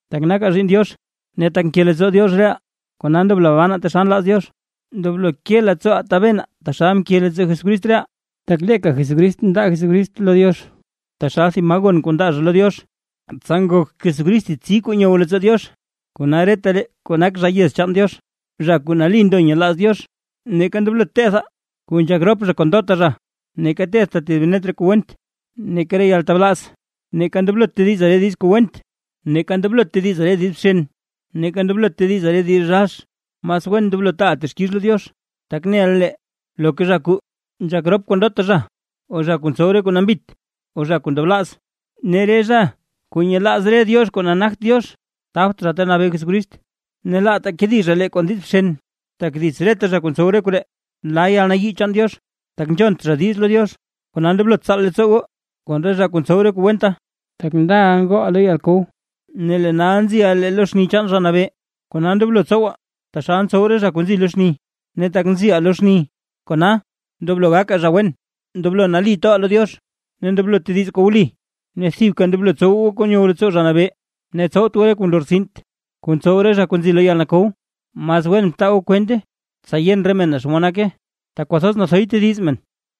Tak nakaa zhiinn Diox ne tak nke leettsoo Diox reʼaa, kona ndoblo banaa taxal nlaaz Diox. Ndoblo ke leettsooʼaa tabenaa, taxal mke leettsoo Jesucrist reʼaa, tak leeka lee Jesucrist mndaa Jesucrist lo Diox, taxal thib maa gon kuu ndaa zha lo Diox, ne nak Jesucrist thib tsi kuu nyow leettsoo Diox. Kona retalee kuu nak zha yez chaan Diox, zha kuu nali ndo nyelaaz Diox, neeka ndoblot tethaa: kuu nzhak rop zha kon ndota zha, neeka tethtaa tedib net re kuu went, neeka re yaltablaaz. Neeka ndoblot tedizaa re diiz kuu went, neeka ndoblot tedizaa re diiz bxen, neeka ndoblot tedizaa re diiz rax; mas wen ndoblo taaʼaa texkix lo Diox. Tak neʼa lee loka zha kuu: nzhak rop kon ndota zha, o zha kuu ntsow re kuu nambit, o zha kuu ndablaaz, ne zha kuu nyelaaz re diox kuu nagt Diox, tabt zha Ta Nabee Jesucrist ne Diox. Ne laataa kedi zha lee kon diiz bxen, tak dits reta zha kuu ntsow re koree la yalnayii chaan Diox, tak nzhont zha diiz lo Diox. Kona ndoblot tsaal leettsoo goo kon re zha kuu ntsow re kuu wenta. Tak ndala ngooʼaa lo yalkow, ne lee nal nziʼaa lee lo xni chaan Zha Nabee, kona ndoblo tsowaa taxal ntsow re zha kuu nzi lo xni, ne tak nziʼaa lo xni kona: ndoblo gakaa zha wen, ndoblo nali toʼaa lo Diox, ne ndoblo tedizaa kuu wli. Ne thibka ndoblo tsow goo kuu nyow leettsoo Zha Nabee. Ne tsowt goo re kuu nlortsint, kuu ntsow re zha kuu nzi lo yalkow na; mas wen btaa goo kwente, tsa yen re men naa xomod nake. Tak kwathoz nathoy tediz men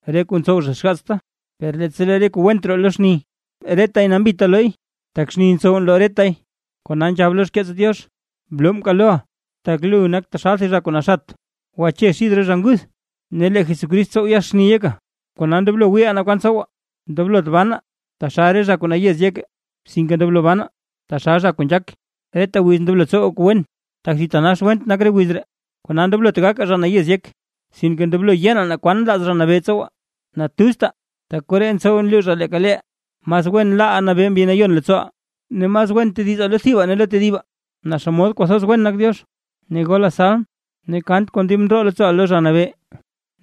re kuu ntsow zha xgaatsta; per leettsa lee reta kuu went roo lo xni, retay nambita nlooy, tak xni ntsow nloo retay. Kona nzhab lo xkeets Diox: Bloo mkaal loʼa, tak lu nak taxal thib zha kuu naxat; gwache xid re zha nguth, ne lee Jesucrist tsow yaxni yeka. Kona ndoblo wiiʼaa naa kwan tsowaa, ndoblot banaa taxal re zha kuu nayez yek, sinke ndoblo banaa taxal zha kuu nzhaak. Reta wiz ndoblo tsowaa kuu wen, tak thitanax went nak re wiz ree. Kona ndoblot gakaa zha nayez yek, sinke ndoblo yenaa naa kwan nlaaz Zha Nabee tsowaa. Natuztaa, tak koree ntsow nluuzhaa leeka leeʼaa, mas wen ndoblo laaʼaa nabee Mbi Nayon leettsooʼaa. Ne mas wen tedizaa lo thibaa ne lo tedibaa, naa xa xomod kwathoz wen nak Diox ne golaa salm ne kant kon dib ndroo leettsooʼaa lo Zha Nabee.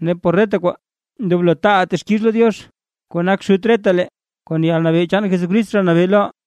Ne por reta kwaa ndoblo taaʼaa texkix lo Diox kuu nak Xut retalee, kon yalnabee chaan Jesucrist Zha Nabee loʼaa.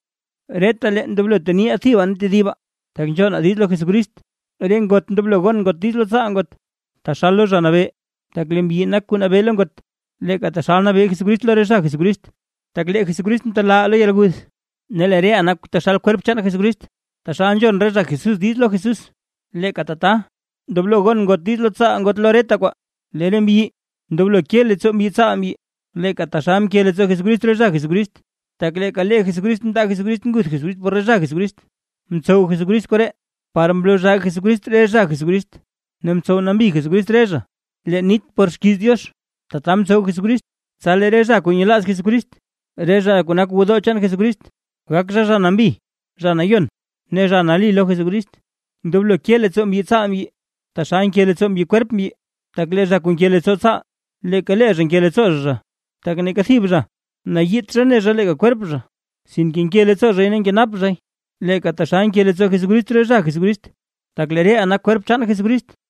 Retalee ndoblo teniʼaa thibaa ne tedibaa, tak nzhonaa diiz lo Jesucrist. Re ngot ndoblo gon ngot diiz lo tsaal ngot, taxal lo Zha Nabee. Tak lee mbyi nak kuu nabee lo ngot, leeka taxal nabee Jesucrist lo re zha Jesucrist. Tak lee Jesucrist mtelaaʼaa lo yalguth, ne lee reʼaa nak taxal kwerp chaan Jesucrist. Taxal nzhon re zha Jesús diiz lo Jesús, leeka tata ndoblo gon re ngot diiz lo tsaal ngot lo reta kwaa. Lee re mbyi ndoblo ke leettsoo mbyi tsaal mbyi, leeka taxal mke leettsoo Jesucrist re zha Jesucrist, tak leeka lee Jesucrist mndaa Jesucrist nguth por re zha Jesucrist, mtsow Jesucrist koree par mloo zhaa Jesucrist re zha Jesucrist, ne mtsow nambi Jesucrist re zha leen nit por xkiiz Diox. Tata mtsow Jesucrist, tsa lee re zha kuu nyelaaz Jesucrist, re zha kuu nak gwodoo chaan Jesucrist, gak zha, zha nambi, zha nayon ne zha nali lo Jesucrist. Ndoblo ke leettsoo mbyi tsaal mbyi, taxal nke leettsoo mbyi kwerp mbyi. Tak lee zha kuu nke leettsoo tsaal leeka lee zha nke leettsoo zha zha. Tak neeka thib zha nayiit zha ne zha leeka kwerp zha, sinke nke leettsoo zhay ne nkenap zhay, leeka taxal nke leettsoo Jesucrist re zha Jesucrist, tak lee reʼaa nak kwerp chaan Jesucrist.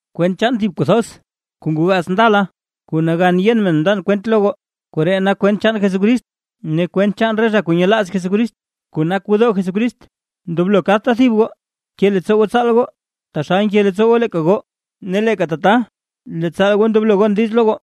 Kwent chaan thib kuu thoz kuu ngoo gaats ndala, kuu nagan yen men mndan kwent lo goo, koree nak kwent chaan Jesucrist ne kwent chaan re zha kuu nyelaaz Jesucrist, kuu nak gwodoo chaan Jesucrist. Ndoblo kadta thib goo ke leettsoo goo tsaal goo, taxal nke leettsoo goo leeka goo, ne leeka tata lee tsaal goo ndoblo gon diiz lo goo.